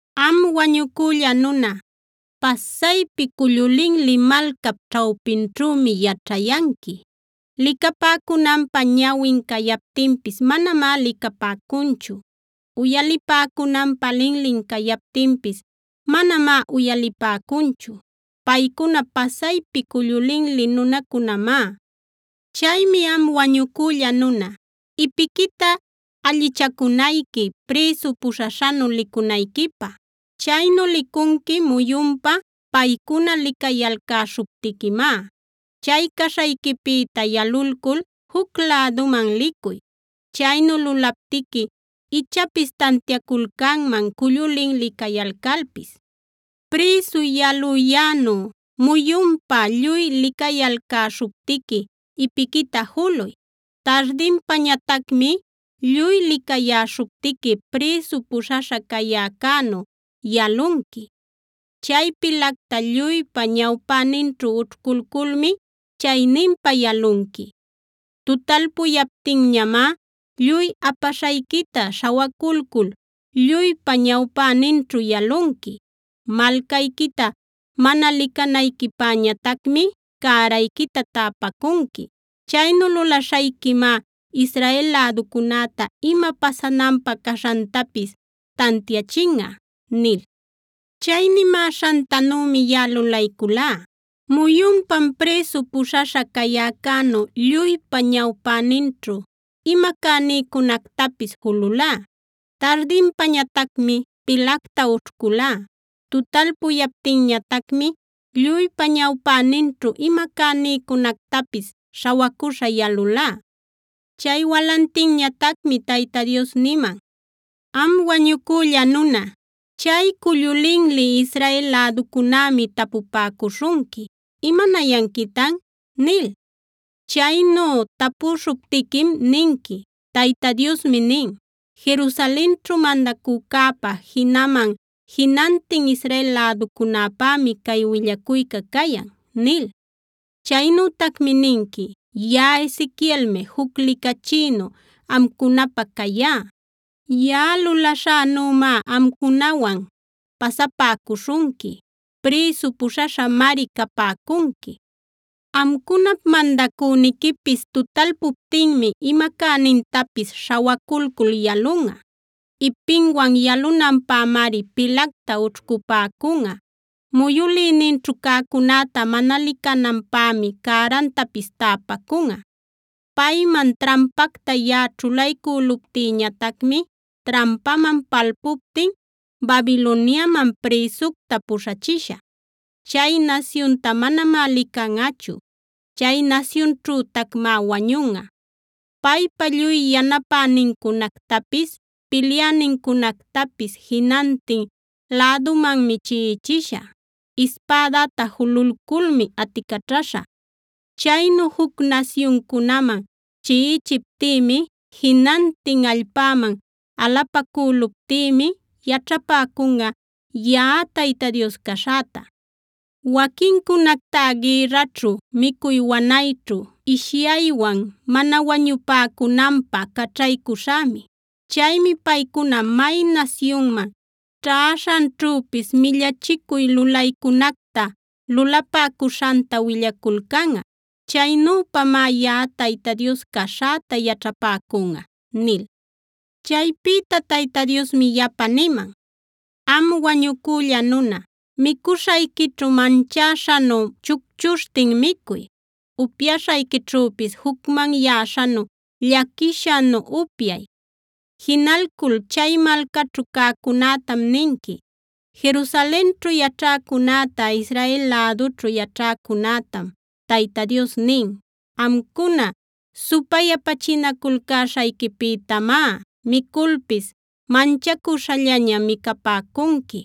“Am wañucülla nuna, pasaypi cullu linli malcap ćhawpinćhümi yaćhayanqui. Licapäcunanpä ñawin cayaptinpis manamá licapäcunchu. Uyalipäcunanpä linlin cayaptinpis manamá uyalipäcunchu.a Paycuna pasaypi cullu linli nunacunamá. “Chaymi am wañucülla nuna, ipiquita allichacunayqui prïsu puśhaśhanu licunayquipä. Chaynu licunqui muyunpa paycuna licayalcäśhuptiquimá. Chay caśhayquipïta yalulcul juc läduman licuy. Chaynu lulaptiqui ichapis tantiaculcanman cullu linli cayalcalpis. Prïsu yaluyänu muyunpa lluy licayalcäśhuptiqui ipiquita juluy. Tardinpañatacmi lluy licayäśhuptiqui prïsu puśhaśha cayäcänu yalunqui. Chay pilacta lluypa ñawpäninćhu ućhculculmi chayninpa yalunqui. Tutalpuyaptinñamá lluy apaśhayquita śhawaculcul lluypa ñawpäninćhu yalunqui. Malcayquita mana licanayquipäñatacmi cärayquita täpacunqui. Chaynu lulaśhayquimá Israel läducunäta ima pasananpä caśhantapis tantiachinꞌa” nil. Chay nimäśhantanümi yaꞌa lulayculá: Muyunpam prïsu puśhaśha cayäcänu lluypa ñawpäninćhu ima cänïcunactapis jululá. Tardinpañatacmi pilacta ućhcülá. Tutalpuyaptinñatacmi lluypa ñawpäninćhu ima cänïcunactapis śhawacuśha yalulá. Chay walantinñatacmi Tayta Dios niman: “Am wañucülla nuna, chay cullu linli Israel läducunämi tapupäcuśhunqui: ‘¿Imanayanquitan?’ nil. Chaynu tapuśhuptiquim ninqui: ‘Tayta Diosmi nin: Jerusalenćhu mandacücäpa, jinaman jinantin Israel läducunäpämi cay willacuyca cayan’ nil. Chaynütacmi ninqui: ‘Yaꞌa Ezequielmi juc licachïnu amcunapä cayá. Yaꞌa lulaśhänümá amcunawan pasapäcuśhunqui; prïsu puśhaśhamari capäcunqui. Amcunap mandacüniquipis tutalpuptinmi ima cänintapis śhawaculcul yalunꞌa. Ipinwan yalunanpämari pilacta ućhcupäcunꞌa; muyülïninćhu cäcunäta mana licananpämi cärantapis täpacunꞌa. Payman trampacta yaꞌa ćhulaycüluptïñatacmi trampaman palpuptin Babiloniaman prïsucta puśhachishä.b Chay nasyunta manamá licanꞌachu; chay nasyunćhütacmá wañunꞌa. Paypa lluy yanapänincunactapis, pilyänincunactapis jinantin lädumanmi chiꞌichishä; ispädäta jululculmi aticaćhaśhä. Chaynu juc nasyuncunaman chiꞌichiptïmi, jinantin allpäman alapacüluptïmi yaćhapäcunꞌa yaꞌa Tayta Dios caśhäta. Waquincunactá gïrraćhu, micuy wanayćhu, ishyaywan mana wañupäcunanpä caćhaycuśhämi. Chaymi paycuna may nasyunman ćhäśhanćhüpis millachicuy lulaycunacta lulapäcuśhanta willaculcanꞌa. Chaynüpamá yaꞌa Tayta Dios caśhäta yaćhapäcunꞌa’” nil. Chaypïta Tayta Diosmi yapa niman: “Am wañucülla nuna, micuśhayquićhu manchäśhanu chucchuśhtin micuy; upyaśhayquićhüpis jucmanyäśhanu, llaquishanu upyay. Jinalcul chay malcaćhu cäcunätam ninqui: ‘Jerusalenćhu yaćhäcunäta, Israel lädućhu yaćhäcunätam Tayta Dios nin: Amcuna supayapachinaculcäśhayquipïtamá miculpis manchacuśhallaña micapäcunqui;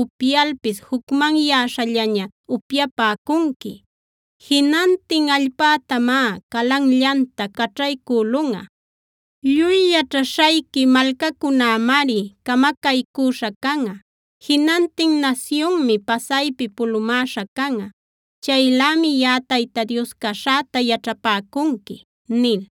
upyalpis jucmanyäśhallaña upyapäcunqui. Jinantin allpätamá calanllanta caćhaycülunꞌa. Lluy yaćhaśhayqui malcacunämari camacaycüśha canꞌa; jinantin nasyunmi pasaypi pulumäśha canꞌa. Chaylämi yaꞌa Tayta Dios caśhäta yaćhapäcunqui’” nil.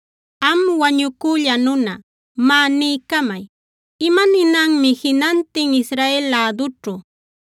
“Am wañucülla nuna, má niycamay, ¿imaninanmi jinantin Israel lädućhu: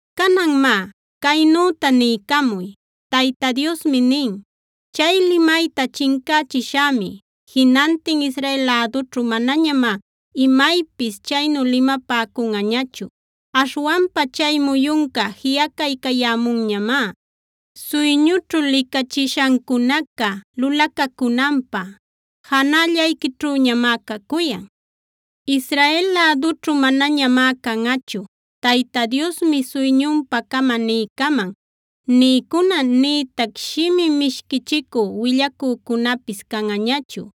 Canan má, caynüta niycamuy: Tayta Diosmi nin: ‘Chay limayta chincächishämi. Jinantin Israel lädućhu manañamá imaypis chaynu limapäcunꞌañachu. Aśhwanpa chay muyunca jiꞌacaycayämunñamá; suyñućhu licachishancunaca lulacacunanpä janällayquićhüñamá cacuyan. Israel lädućhu manañamá canꞌachu “Tayta Diosmi suyñunpa-cama niycaman” nïcuna, nïtac shimi mishquichicü willacücunapis canꞌañachu.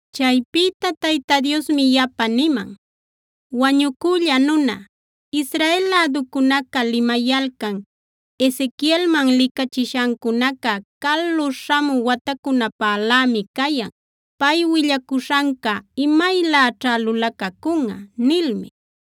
Chaypïta Tayta Diosmi yapa niman: “Wañucülla nuna, Israel läducunaca limayalcan: ‘Ezequielman licachishancunaca calu śhamü watacunapälämi cayan. Pay willacuśhanca imayläćhá lulacacunꞌa’ nilmi.